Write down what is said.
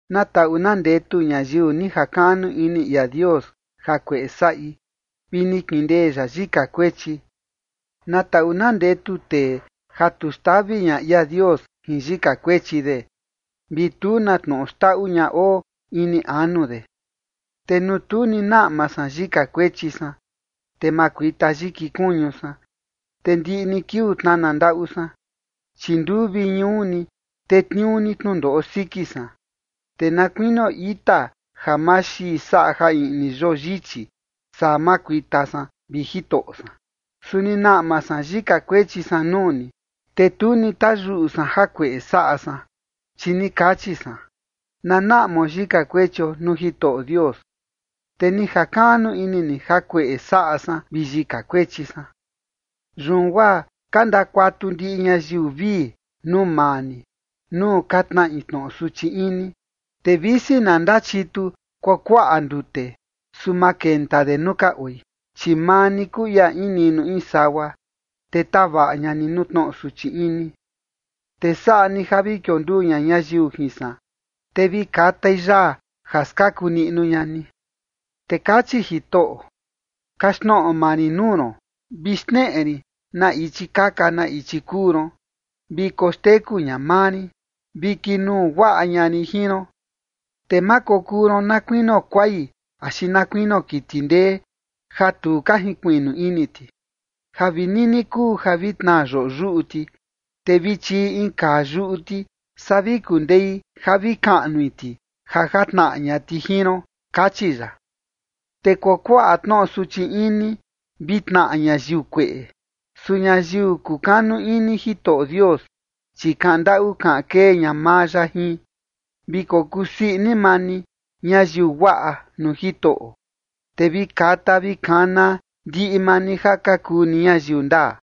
Na taꞌu na ndetu ñayiu ni jakaꞌnu ini ia Dios jakueꞌe saꞌi vi ni kindee ya yika kuechi. Na taꞌu na ndetu tee ja tu xtavi ña ia Dios jin yika kuechi de, vi tu na tnoꞌo xndaꞌu ña oo ini anu de. Te nuu tu ni naꞌma san yika kuechi san, te makuita yiki kuñu san, te ndiꞌi ni kiuu tnana ndaꞌu san. Chi nduu vi ñuu ni tetniuu ni tnundoꞌo siki san, te na kuinio ita ja maxii saꞌa ja iꞌni yoo yichi, saa makuita san, vi Jitoꞌo san. Su ni naꞌma san yika kuechi san nuu ni, te tu ni tayuꞌu san jakueꞌe saꞌa san, chi ni kachi san: “Na naꞌmao yika kuechio nuu Jitoꞌo Dios”. Te ni jakaꞌnu ini ni jakueꞌe saꞌa san vi yika kuechi san. Yun guaa ka ndakuatu ndiꞌi ñayiu vii nuu maa ni, nuu ka tnaꞌi tnoꞌo suchi ini. Te visi na ndachitu kuakuaꞌa ndute, su ma kenta de nuu ka oi. Chi maa ni kuu ia in niꞌnu in sagua, te tavaꞌa ña ni nuu tnoꞌo suchi ini, te saꞌa ni ja vi kionduu ña ñayiu jin san, te vi katai yaa ja skaku niꞌnu ña ni. Te kachi Jitoꞌo: “Kaxtnoꞌo maa rin nuu ron, vi xneꞌe rin na ichi kaka na ichi kuu ron, vi koxteku ña maa rin, vi kinuu guaꞌa ña rin jin ron. Te ma kokuu ron na kuinio kuai, axi na kuinio kiti ndee, ja tu ka jinkuiꞌnu ini ti, ja vi nini kuu ja vi tnaa ñayiu yoꞌo yuꞌu ti, te vi chiꞌi in kaa yuꞌu ti, saa vi kundei ja vi kaꞌnui ti ja jatnaꞌa ña ti jin ron”, kachi ya. Te kuakuaꞌa tnoꞌo suchi ini vi tnaꞌa ñayiu kueꞌe, su ñayiu kukanu ini Jitoꞌo Dios, chi kaꞌan ndaꞌu kaꞌan kee ña maa ya jin. Vi kokuu sii ini maa ni, ñayiu guaꞌa, nuu Jitoꞌo, te vi kata vi kana ndiꞌi maa ni ja ka kuu ni ñayiu ndaa.